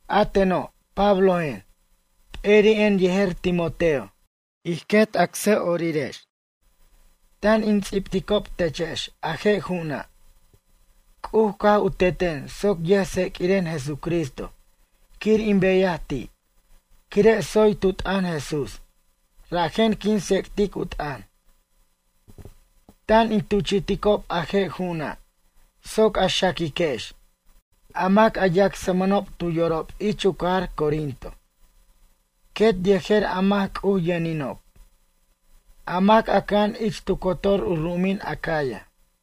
A teno' Pablojen, p'eri'en yejer Timoteo, ij quet acsa'orirex, tan in ts'ibticob techex a je' ju'una'. C'uj caj u teten soc yʌj tseq'uiren Jesucristo quir in beyaj ti', quire' tsoy tu t'ʌn Jesús, rajen quin tsec'tic u t'ʌn. Tan in tuchi'ticob a je' ju'una' soc a xaquiquex, a mac a yacsmʌnob tu yorob ich u cajar Corinto quet yejer a mac C'uj yʌninob, a mac a cʌja'an ich tu cotor u ru'umin Acaya.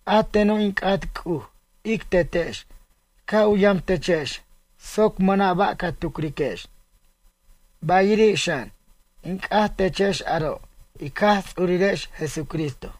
A teno' in c'at C'uj ic Tetex ca' u yam techex soc mʌna' ba' ca tucriquex. Bayiri' xan, in c'at techex aro' ic Jaj Ts'urirex Jesucristo.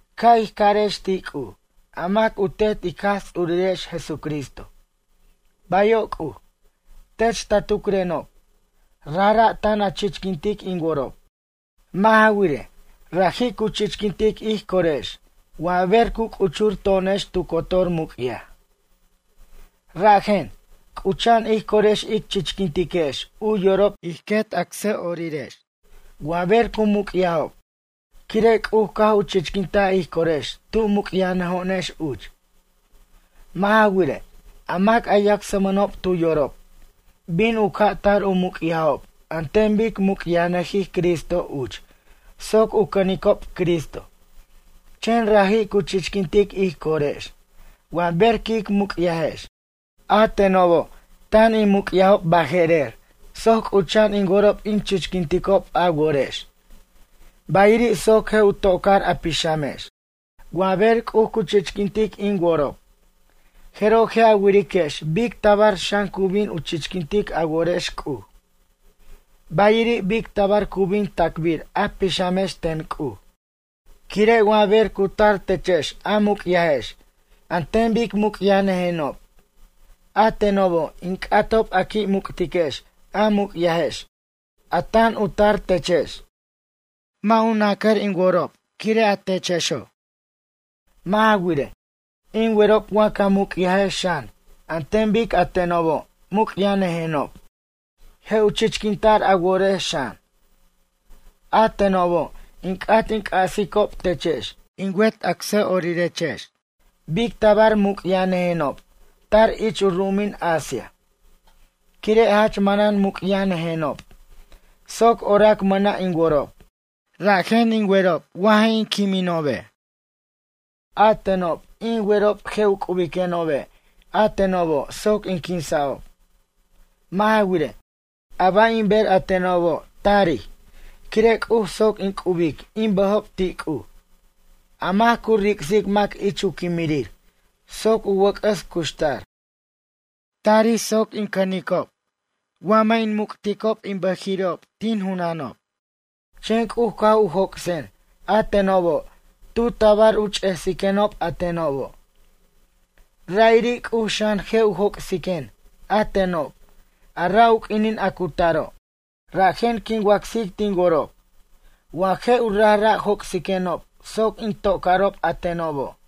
Ca' ij carex ti' C'uj, a mac u Tet ic Jaj Ts'urirex Jesucristo: “Bayo' C'uj, tech ta tucrenob, rajra' tan a chichquintic in worob.” Mʌ' ja wirej, raji' cu chichquintic ij corex wa ber cu c'uchur to'onex tu cotor muc'yaj. Rajen, c'ucha'an ij corex ic chichquintiquex u yorob ij quet acsa'orirex wa ber cu muc'yajob, quire' C'uj caj u chichquintaj ij corex tu muc'yajnʌjo'onex uch. Mʌ' ja wirej, a mac a yacsmʌnob tu yorob, bin u ca' tar u muc'yajob an ten bic muc'yajnʌjij Cristo uch soc u cʌnicob Cristo, chen raji' cu chichquintic ij corex wa ber quic muc'yajex. A tenobo' tan in muc'yajob baje'rer soc c'ucha'an in worob in chichquinticob a worex, bayiri' soc je' u to'car a pixamex. Wa ber C'uj cu chichquintic in worob, jeroj je' a wiriquex bic tabar xan cu bin chichquintic a worex C'uj. Bayiri' bic tabar cu bin tacbir a pixamex ten C'uj. Quire' wa ber cu tar techex a muc'yajex an ten bic muc'yajnʌjenob, a tenobo' in c'atob a qui' muc'tiquex a muc'yajex a tan u tar techex. Mʌ' nacʌr in worob quire' a techexo'. Mʌ' ja wirej, in werob wa ca muc'yajex xan an ten bic a tenobo' muc'yajnʌjenob je' u chichquinta'r a worex xan. A tenobo' in c'at in c'asicob techex, in wet acsa'orirex bic tabar muc'yajnʌjenob tar ich u ru'umin Asia. Quire' jach manan muc'yajnʌjenob soc orac mʌna' in worob, rajen in werob wa je' in quimenobe'. A tenob in werob je' u c'ubiquenobe' a tenobo' soc in quinsa'ob. Mʌ' ja wirej, a ba' in ber a tenobo' tarij quire' C'uj soc in c'ubic in bʌjob ti' C'uj, a mac cu ric'sic mac ich u quimirir soc u wʌc'ʌs cuxtar. Tarij soc in cʌnicob wa mʌ' in muc'ticob in bʌjiri'ob tin junanob. Chen C'uj caj u joc'sen a tenobo' tu tabar u ch'esiquenob a tenobo'. Ra'iri' C'uj xan je' u joc'siquen a tenob a ra' u q'uinin a cu taro', rajen quin wacsic tin worob wa je' u rajra' joc'siquenob soc in to'carob a tenobo'.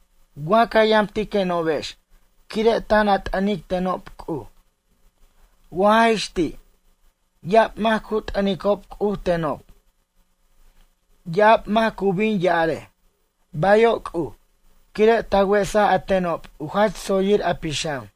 Wa ca yamtiquenobex quire' tan a t'ʌnic tenob C'uj. Wa jaj ix ti', ya'ab mac cu t'ʌnicob C'uj tenob, ya'ab mac cu bin ya'arej: “Bayo' C'uj” quire' ta wesaj a tenob u jach tsoyir a pixam.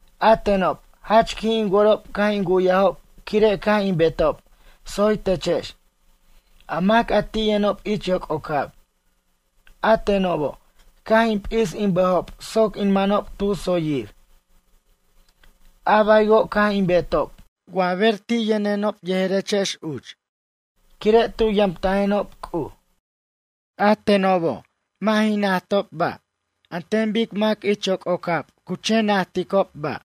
A tenob jach qui' in worob caj in wu'yajob quire' caj in betob tsoy techex, a mac a ti' yʌnob ich yoc'ocab. A tenobo' caj in p'is in bʌjob soc in manob tu tsoyir. A baywo' caj in betob wa ber ti' yʌnenob yejerechex uch, quire' tu yamtajenob C'uj. A tenobo' mʌ' jin najtob ba' an ten bic mac ich yoc'ocab cu chen najticob ba'.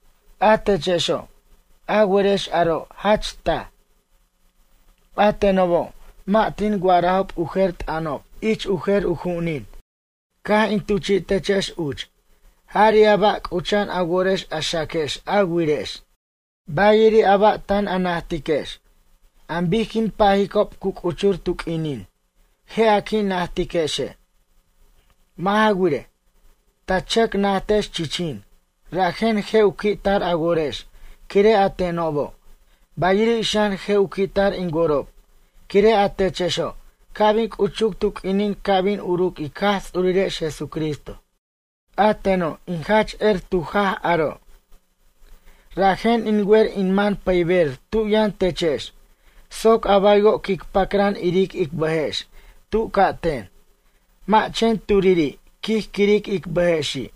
A techexo', a werex aro' jach taj. A tenobo' mʌ' tin wa'arajob u jer t'ʌnob ich u jer u ju'unin caj in tuchi'techex uch, jari' a ba' c'ucha'an a worex a xaquex a wirex. Bayiri' a ba' tan a najtiquex, an bic quin pajicob cu c'uchur tu q'uininin je' a qui' najtiquexe'. Mʌ' ja wirej, ta chʌc najtex chichin rajen je' u qui' tar a worex quire' a tenobo', bayiri' xan je' u qui'tar in worob quire' a techexo' ca' bin c'uchuc tu q'uinin ca' bin uruc ic Jaj Ts'urirex Jesucristo. A teno' in jach er tu jaj aro'. Rajen in wer in man pʌyber tu yʌn techex soc a baywo' quic pacran iric ic bʌjex tu ca'ten, mʌ' chen turiri' quij quiric ic bʌjexi'.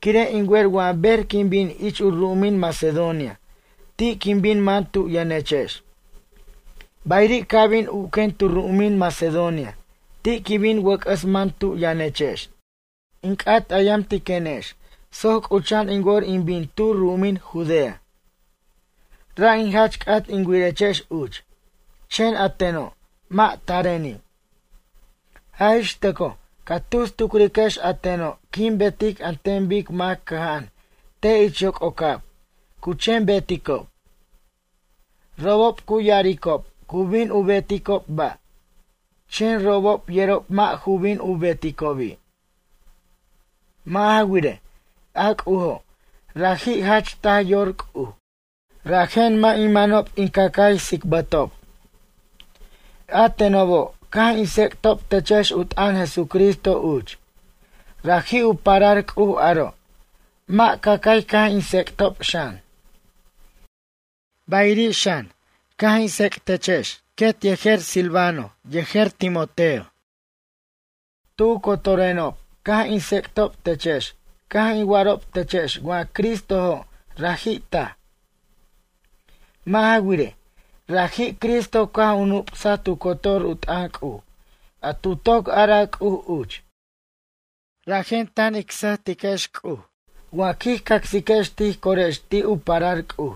Quire' in wer wa ber quin bin ich u ru'umin Macedonia ti' quin bin man tu yʌnechex. Bayiri' ca' bin uquen tu ru'umin Macedonia ti' quin bin wʌc'ʌs man tu yʌnechex. In c'at a yamtiquenex soc c'ucha'an in wor in bin tu ru'umin Judea. Ra' in jach c'at in wirechex uch, chen a teno' mʌ' tareni'. Jaj ix tʌcoj ca tus tucriquex a teno' quin betic an ten bic mac cʌja'an te' ich yoc'ocab cu chen beticob. Robob cu ya'aricob cu bin u beticob ba', chen robob yerob mʌ' ju bin u beticobi'. Mʌ' ja wirej, a C'ujo', raji' jach taj yor C'uj, rajen mʌ' in manob in cacay tsicbʌtob. A tenobo' caj in tsec'tob techex u t'ʌn Jesucristo uch, raji' u parar C'uj aro' mʌ' cacay caj in tsec'tob xan. Bayiri' xan, caj in tsec'techex quet yejer Silvano yejer Timoteo. Tu cotorenob caj in tsec'tob techex caj in wa'arob techex wa Cristojo' raji' taj. Mʌ' ja wirej, raji' Cristo caj u nup'saj tu cotor u t'ʌn C'uj a tu toc araj C'uj uch. Rajen tan ic sʌjtiquex C'uj wa quij cacsiquex tij corex ti' u parar C'uj.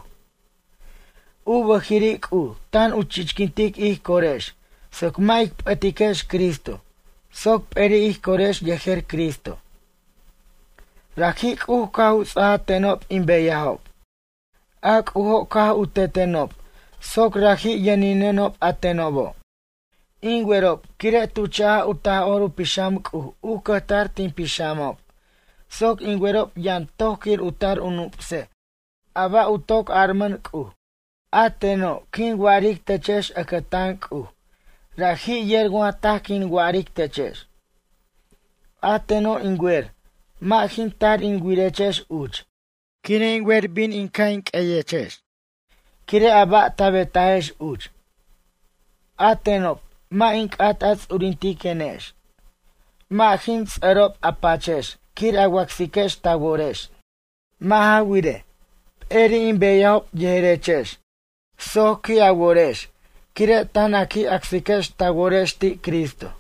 U bʌjiri' C'uj tan u chichquintic ij corex soc mʌ' ic p'ʌtiquex Cristo soc p'eri' ij corex yejer Cristo. Raji' C'uj caj u ts'aja tenob in beyajob. A C'ujo' caj u tetenob soc raji' yʌninenob a tenobo'. In werob quire' tu chaj u Taj'or u Pixam C'uj u cʌjtar tin pixamob soc in werob yʌn toj quir u tar u nup'sej a ba' u toc aramʌn C'uj. A teno' quin wa'aric techex ʌcʌtan C'uj raji' yer wa taj quin wa'aric techex. A teno' in wer mʌ' jin tar in wirechex uch quire' in wer bin in ca' in q'ueyechex quire' a ba' ta betajex uch. A tenob mʌ' in c'at a ts'urintiquenex, mʌ' jin ts'ʌrob a pachex quir a wacsiquex ta worex. Mʌ' ja wirej, p'eri' in beyajob yejerechex soc qui' a worex quire' tan a qui' acsiquex ta worex ti Cristo.